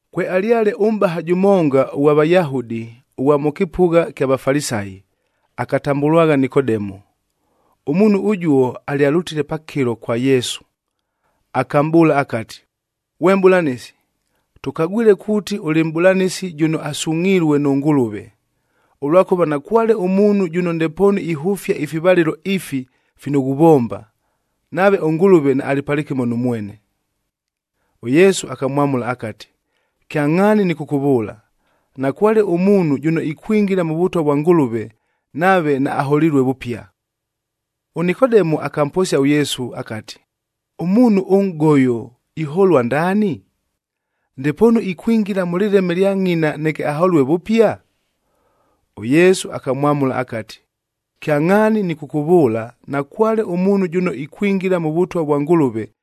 Kwealyale ʉmʼbaha jʉmonga ʉghwa Vayahudi, ʉghwa mʉ kɨpʉgha kya Vafalisayi, akatambʉlwagha Nikodemu. Ʉmuunhu ʉjuo alyalʉtile pakɨlo kwa Yesu, akamʼbʉʉla akati, “Ghwe Mʼbʉlanɨsi, tʉkagwile kuuti ʉlɨ Mʼbʉlanɨsi jʉno asungʼhilue nʉ Ngʉlʉve, ʉlwakʉva nakwale ʉmuunhu jʉno ndepoonu ihʉfia ifivalɨlo ifi fino ghuvomba, nave ʉNgʉlʉve naalɨ palɨkɨmo nʉ mwene.” ɄYesu akamwamʉla akati, “Kyangʼhaani nɨkʉkʉvʉʉla, nakwale ʉmuunhu jʉno ikwingila mʉ Vʉtwa vwa Ngʉlʉve, nave naaholilue vʉpia.” ɄNikodemu akamposia ʉYesu akati, “Ʉmuunhu ʉnʼgoyo iholua ndaani? Ndepoonu ikwingila mʉ lɨleme lya ngʼina neke aholue vʉpia?” ɄYesu akamwamʉla akati, “Kyangʼhaani nɨkʉkʉvʉʉla, nakwale ʉmuunhu jʉno ikwingila mʉ Vʉtwa vwa Ngʉlʉve,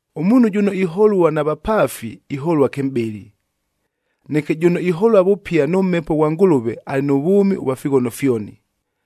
Ʉmuunhu jʉno iholua na vapaafi, iholua kɨmʼbɨlɨ. Neke jʉno iholua vʉpia nʉ Mhepo ghwa Ngʉlʉve alɨ nʉ vwʉmi ʉvwa fighono fyoni.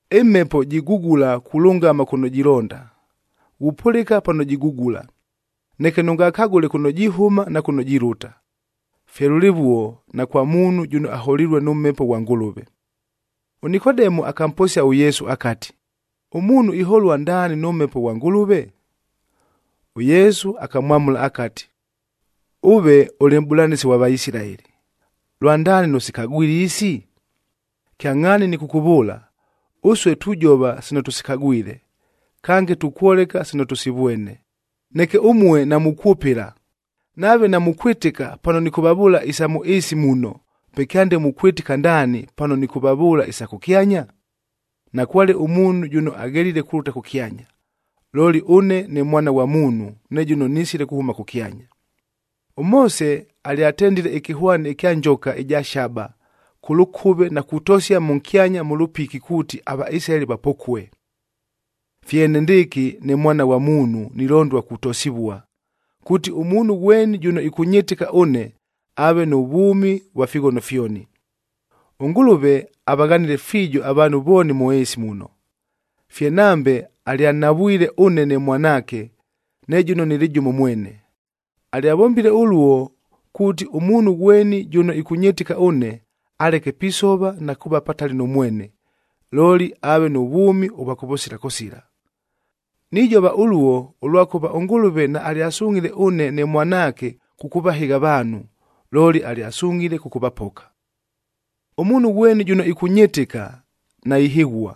Ɨmhepo jigugula kulʉngama kʉno jilonda. Ghupʉlɨka pano jigugula, neke nʉngakagʉle kʉno jihʉma na kʉno jilʉta. Fye lʉlɨvuo na kwa muunhu jʉno aholilue nʉ Mhepo ghwa Ngʉlʉve.” ɄNikodemu akamposia ʉYesu akati, “Ʉmuunhu iholua ndaani nʉ Mhepo ghwa Ngʉlʉve?” ɄYesu akamwamʉla akati, “Ʉve ʉlɨ mʼbʉlanɨsi ghwa Vaisilaeli, lwandaani nʉsikagwile isi? Kyangʼhaani nɨkʉkʉvʉʉla, ʉsue tujova sino tʉsikagwile, kange tukwoleka sino tʉsivwene, neke ʉmue namukwʉpɨla. Nave namukwɨtɨka pano nɨkʉvavʉʉla isa mʉ ɨɨsi muno, pe kyande mukwɨtɨka ndaani, pano nɨkʉvavʉʉla isa kʉkyanya? Nakwale ʉmuunhu jʉno aghelile kulʉta kʉkyanya, looli ʉne ne Mwana ghwa Muunhu ne jʉno nisile kuhʉma kʉkyanya. “ɄMoose alyatendile ɨkɨhwani ɨkya njoka ɨja shaba kʉ lʉkʉve na kutosia mʉnkyanya mʉ lʉpikib kuuti aVaisilaeli vapokue. Fye enendɨɨkɨ ne Mwana ghwa Muunhu nilondua kutosivua, kuuti ʉmuunhu ghweni jʉno ɨkʉnyɨtɨka ʉne aave nʉ vwʉmi ʉvwa fighono fyoni. “ɄNgʉlʉve avaghanile fiijo avaanhu vooni mʉ ɨɨsi muno. Fye nambe alyanhavwile ʉne ne mwanaake, ne jʉno nɨlɨ jʉmo mwene. Alyavombile ʉluo, kuuti ʉmuunhu ghweni jʉno ɨkʉnyɨtɨka ʉne, aleke pisova na kuuva patali nʉ mwene, looli aave nʉ vwʉmi ʉvwa kʉvʉsila kʉsila. Nijova ʉluo, ʉlwakʉva ʉNgʉlʉve naalyasungʼhile ʉne ne Mwanaake kʉkʉvahɨgha avaanhu, looli alyasungʼhile kʉkʉvapoka. “Ʉmuunhu ghweni jʉno ɨkʉnyɨtɨka, naihɨghua.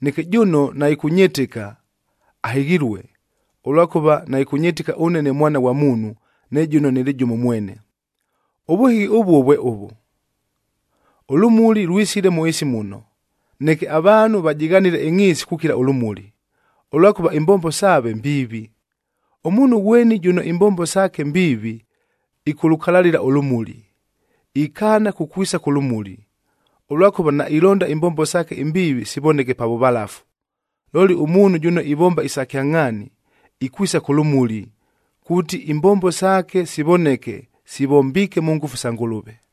Neke jʉno naɨkʉnyɨtɨka ahɨghilue, ʉlwakʉva naɨkʉnyɨtɨka ʉne ne Mwana ghwa Ngʉlʉve, ne jʉno nɨlɨ jʉmo mwene. Ʉvʉhɨghi ʉvuo vwe ʉvʉ: Ʉlʉmuli lwisile mʉ ɨɨsi muno, neke avaanhu vajɨghanile ɨngʼhiisi kukila ʉlʉmuli, ʉlwakʉva imbombo saave mbiivi. Ʉmuunhu ghweni jʉno imbombo saake mbiivi, ɨkʉlʉkalalɨla ʉlʉmuli, ikaana kukwisa kʉ lʉmuli, ʉlwakʉva nailonda imbombo saake imbiivi sivoneke pa vʉvalafu. Looli ʉmuunhu jʉno ivomba isa kyangʼhaani, ikwisa kʉ lʉmuli, kuuti imbombo saake sivoneke sivombiike mʉ ngʉfu sa Ngʉlʉve.”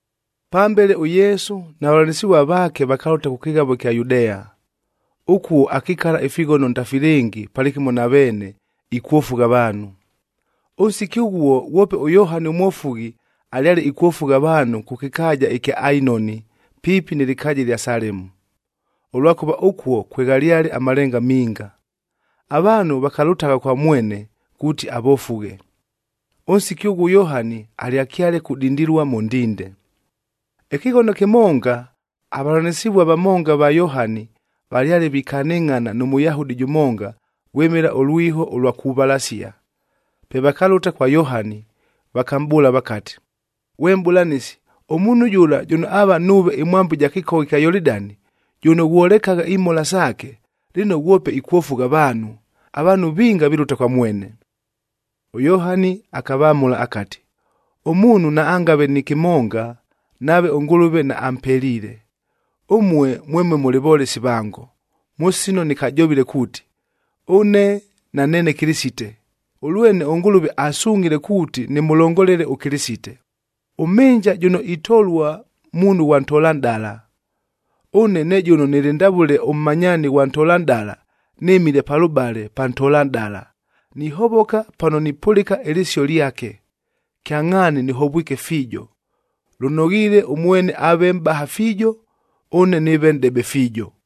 Pambele ʉYesu na vavʉlanɨsɨvua vaake vakalʉta kʉ kɨghavo ɨkya Yudea. Ʉkuo akikala ifighono ndafilɨngi palɨkɨmo na veene, ikwofugha avaanhu. Ʉnsiki ʉghuo, ghwope ʉYohani ʉMwofughi alyale ikwofugha avaanhu kʉ kɨkaaja ɨkya Ainoni, piipi nɨ lɨkaaja ɨlya Salemu, ʉlwakʉva ʉkuo kweghalyale amalenga minga. Avaanhu vakalʉtagha kwa mwene, kuuti avofughe. Ʉnsiki ʉghuo ʉYohani alyakyale kudindilua mʉ ndinde. Ɨkɨghono kɨmonga, avavʉlanɨsɨvua vamonga va Yohani, valyale vikanɨngʼhana nʉ Mʉyahudi jʉmonga vwɨmɨla ʉlwiho ʉlwa kuvalasia. Pe vakalʉta kwa Yohani, vakamʼbʉʉla vakati, “Ghwe Mʼbʉlanɨsi, ʉmuunhu jʉla jʉno aava nuuve ɨmwambo ɨja kɨkogha kya Yolidani, jʉno ghwolekagha imhola saake, lɨno ghwope ikwofugha avaanhu. Avaanhu vinga vilʉta kwa mwene.” ɄYohani akavamʉla akati, “Ʉmuunhu naangave nɨ kɨmonga, nave ʉNgʉlʉve naampeliile. Ʉmue mwemue mʉlɨ volesi vango, mʉ sino nɨkajovile kuuti, ‘Ʉne naneene Kɨlɨsite, ʉlwene ʉNgʉlʉve asungʼhile kuuti nɨmʉlongolele ʉKɨlɨsite.’ Ʉmhɨnja jʉno itolua muunhu ghwa ntolanʼdala. Ʉne ne jʉno nɨlɨ ndavʉle ʉmmanyaani ghwa ntolanʼdala, nɨmile palʉbale pa ntolanʼdala, nihovoka pano nipʉlɨka ɨlɨsio lyake. Kyangʼhaani nɨhovwike fiijo. Lʉnoghiile ʉmwene aave mʼbaha fiijo, ʉne nɨɨve nʼdebe fiijo.”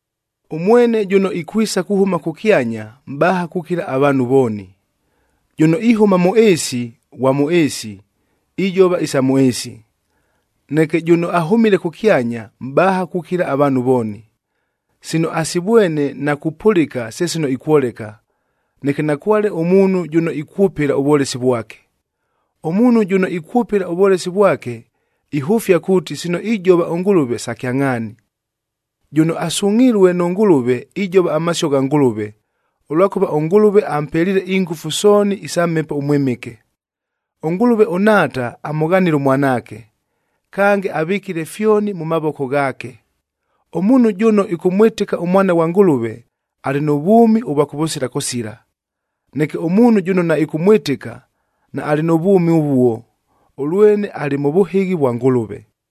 Ʉmwene jʉno ikwisa kuhʉma kʉkyanya mʼbaha kukila avaanhu vooni. Jʉno ihʉma mʉ ɨɨsi, ghwa mʉ ɨɨsi, ijova isa mʉ ɨɨsi. Neke jʉno ahʉmile kʉkyanya mʼbaha kukila avaanhu vooni. Sino asivwene na kupʉlɨka se sino ikwoleka, neke nakwale ʉmuunhu jʉno ikwʉpɨla ʉvwolesi vwake. Ʉmuunhu jʉno ikwʉpɨla ʉvwolesi vwake, ihʉfia kuuti sino ijova ʉNgʉlʉve sa kyangʼhaani. Jʉno asungʼhilue nʉ Ngʉlʉve, ijova amasio gha Ngʉlʉve, ʉlwakʉva ʉNgʉlʉve ampeliile ingʉfu sooni isa Mhepo ʉMwɨmɨke. ɄNgʉlʉve ʉNhaata amʉghanile ʉMwanaake, kange avɨkile fyoni mʉ mavoko ghaake. Ʉmuunhu jʉno ɨkʉmwɨtɨka ʉMwana ghwa Ngʉlʉve, alɨ nʉ vwʉmi ʉvwa kʉvʉsila kʉsila. Neke ʉmuunhu jʉno naɨkʉmwɨtɨka, naalɨ nʉ vwʉmi ʉvuo, ʉlwene alɨ mʉ vʉhɨghi vwa Ngʉlʉve.